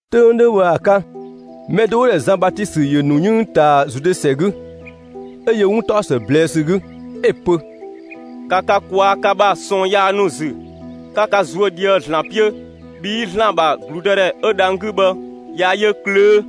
'Töng 'ö 'dhö bhë ‑a 'ka, mɛ do 'wo‑ ‑dhɛ Zan Batisö ‑yö ‑nu 'yënng ꞊taa Zude ‑sɛ 'gü, 'ö yö 'wuntaɔsë ꞊blɛɛ' ‑sü 'gü, 'ö‑ pö: «‑Ka ka ꞊kwaa' ka ‑bha ꞊sɔɔn yaa ‑nu ‑zü, 'ka ka ꞊zuö' ꞊dhië' ‑Zlan 'piö, bhii ‑Zlan ‑bha ‑gludëdhɛ 'ö dhang‑ 'gü bhë, ꞊ya yö ꞊klöö'!»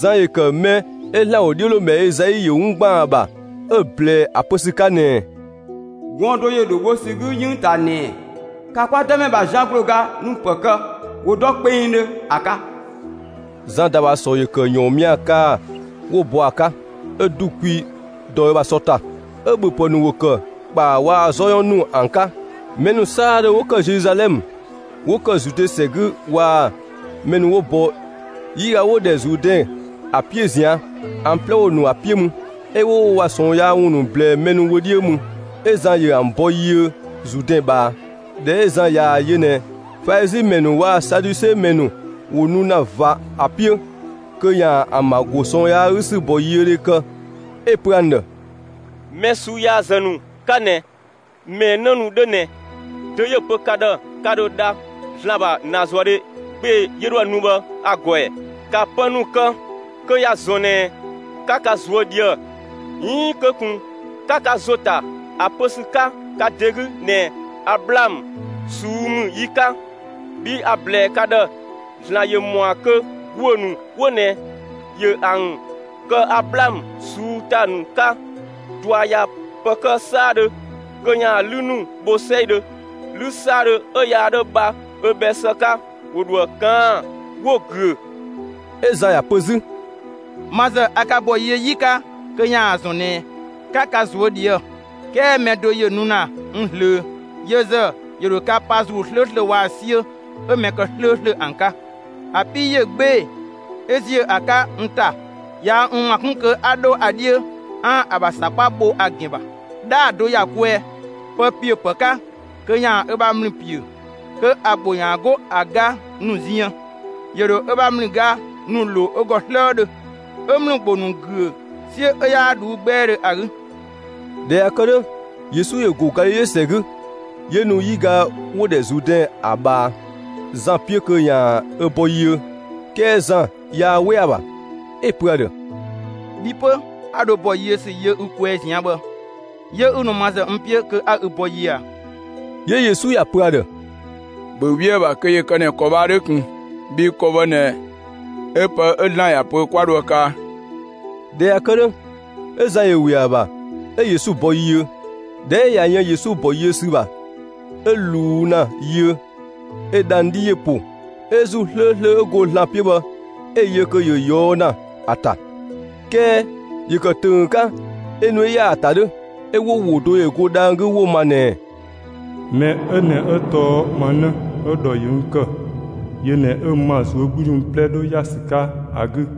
Zan ‑yö ‑kë mɛ 'ö ‑Zlan ‑wodhiölomɛ Ezai ‑yö 'wun 'ö ‑gban ‑a ‑bha 'ö‑ ꞊blɛɛ ‑a pö ‑sü 'ka ꞊nɛɛ: Gɔɔn‑ do ‑yö ‑dhoo bho ‑sü 'gü 'yënng ꞊taa ꞊nɛɛ: ‑Ka kwa Dëmɛ ‑bha zian ‑gblooga ‑nu ‑pë kë, ‑wo dɔ kpengdhö ‑a 'ka! Zan ‑da ‑bha ‑sɔ ‑yö ‑kë ‑yɔɔnmia kaa‑ 'wo‑ bɔ ‑a 'ka, 'ö ‑du kwi dɔ ö bha sɔ ‑ta, 'ö‑ ‑bhöpë ‑nu ‑wo ‑kë ‑kpaa waa‑ 'zɔ 'yɔn ‑nu ‑an 'ka. Mɛ ‑nu 'saadhö 'wo ‑kë Zeluzalɛmë, 'wo ‑kë Zude ‑sɛ 'gü waa‑ mɛ ‑nu 'wo bɔ 'yiga 'wo‑ ‑dhɛ Zuudɛn ‑a 'piö ꞊zian', ‑an 'plɛ ‑wo ‑nu ‑a 'piö mü, 'ö 'wo wo ‑bha ꞊sɔɔn yaa ‑wun ‑nu ꞊blɛɛ mɛ ‑nu wö 'dhiö mü. 'Ö Zan ‑yö ‑an ‑bɔ yiö Zuudɛn ꞊bhaa. ꞊Dhɛ 'ö Zan ꞊yaa‑ yö ꞊nɛ Falizi ‑mɛ ‑nu waa‑ Saduse ‑mɛ ‑nu ‑wo nu ‑na ꞊va ö 'piö, kö ‑yaan ‑an ‑bha ‑go ꞊sɔɔn yaa 'gü ‑bɔyiödhe kë, 'ö‑ pö ‑an ‑dhë: «Mɛ ꞊suu'‑ yaazë ‑nu 'ka ꞊nɛ ꞊mɛɛ 'në ‑nu 'dhö ꞊nɛ, dö 'yö‑ pö ka ‑dhë ka ‑dho dha ‑Zlan ‑bha ‑naazuëdhe 'gbee‑ 'yö 'dhoë‑ nu bhë ‑a ‑gɔ ‑ɛ? ‑Ka pë ‑nu kë kö ‑ya ‑zɔn ꞊nɛ 'ka ka ꞊zuö' ꞊dhië'‑! 'Iin kö ꞊kun 'ka ka ‑zo ta ‑a pö ‑sü 'ka ka ‑de 'gü ꞊nɛɛ: ‹Ablaamö ꞊suu'‑ ‑mü yi 'ka›, bhii a‑ ‑blɛɛ ka ‑dhë: ‑Zlan ‑yö ‑mɔa kö ‑guö ‑nu 'wo ꞊nɛ ‑yö ‑an kë Ablaamö ꞊suu'‑ ‑ta ‑nu 'ka! ꞊Dua ꞊ya ‑pë kë 'saadhö kö ‑yaan 'lü ‑nu bho 'sɛidhö. 'Lü 'saadhö 'ö yaa 'dho bha ö bhɛ ‑së 'ka, ‑wo ‑dho ‑a ꞊kaan'‑ 'wo‑ güö.» 'Ö Zan ‑ya pö 'zü: «Ma ‑zë a ka ‑bɔ yiö 'yi 'ka kö ‑yaan ‑a ‑zɔn ꞊nɛ 'ka ka ꞊zuö' ꞊dhië'‑, 'kɛɛ mɛ do ‑yö nu ‑na n ꞊zlöö, yö ‑zë ‑yö ‑dho ka pa ‑Zuu 'slööslö waa‑ 'siö 'ö mɛ ‑kë 'slööslö ‑an 'ka. ‑A 'pii ꞊yö 'gbee‑ 'ö ‑ziö ‑a 'ka n ‑ta. Yaa n ‑ma 'kun kö 'a 'dho ‑a 'dhiö 'aan‑ ‑a ‑bha ‑sakpa bho ‑a ‑gɛn ‑bha. 'Dhaa‑ do ‑ya kwɛɛ, pë ‑piö ‑pë 'ka kö ‑yaan ö bha ‑mlü ‑piö, kö ‑a ‑gbo ‑yaan 'go ‑a ga ‑nu ziën. ‑Yö ‑dho ö bha ‑mlüga ‑nu ‑lo ö ‑gɔ 'slëëdhö, 'ö ‑mlü ‑gbo ‑nu ‑güö 'siö 'ö 'yaa ꞊dhuu'‑ 'gbɛɛdhö ‑a 'gü.» ꞊Dhɛ ꞊ya kë 'dhö, Yesu ‑yö ‑go Galile ‑sɛ 'gü, 'yö nu 'yiga 'wo‑ ‑dhɛ Zuudɛn ‑a ꞊bhaa, Zan 'piö kö ‑yaan ö bɔ yiö. 'Kɛɛ Zan yaa 'we ‑a ‑bha, 'ö‑ pö ‑a ‑dhë: «Bhi 'pö, 'a dho bɔ yiö ‑sü yö ü kwɛɛ ꞊zian' bhë, 'yö 'ü nu ma ‑zë n 'piö kö 'a ü bɔ yiö ꞊a?» 'Yö Yesu ‑ya ‑pö ‑a ‑dhë: «‑Bhö 'we ‑a ‑bha kö ‑yö ‑kë ꞊nɛ ‑kɔ bhë ‑a 'dhö ꞊kun. Bhii ‑kɔ bhë ꞊nɛ 'ö pë 'ö ‑Zlan ‑ya pö 'kwa dho ‑a kaa.» ꞊Dhɛ ꞊ya kë 'dhö, 'ö Zan ‑yö ‑we ‑a ‑bha, 'ö Yesu ‑bɔ yiö. ꞊Dhɛ 'ö ꞊ya yën Yesu ‑bɔ yiö ‑sü ‑bha 'ö ꞊luu' ‑na yiö, 'ö dhang‑ 'dhi ‑yö ‑po 'ö ‑Zuu 'slööslö 'ö go ‑Zlan 'piö bhë 'ö‑ yö kö ‑yö ꞊yɔɔ' ‑na ‑a ‑ta; 'kɛɛ ‑yö ‑kë ‑tönggö 'ka 'ö nu 'ö ‑ya ‑a ‑ta 'dhö. 'Ö ‑wo ‑wo do ‑yö go dhang‑ 'gü 'wo‑ ma ꞊nɛɛ: «Mɛ 'ö ꞊nɛ 'ö tɔɔ ma 'në 'ö‑ ‑dhɔ ‑yö n ‑kë, yö ꞊nɛ 'ö n ‑ma ꞊zuögludhi ‑wun 'plɛ 'dhö ‑ya ‑sü 'ka ‑a 'gü.»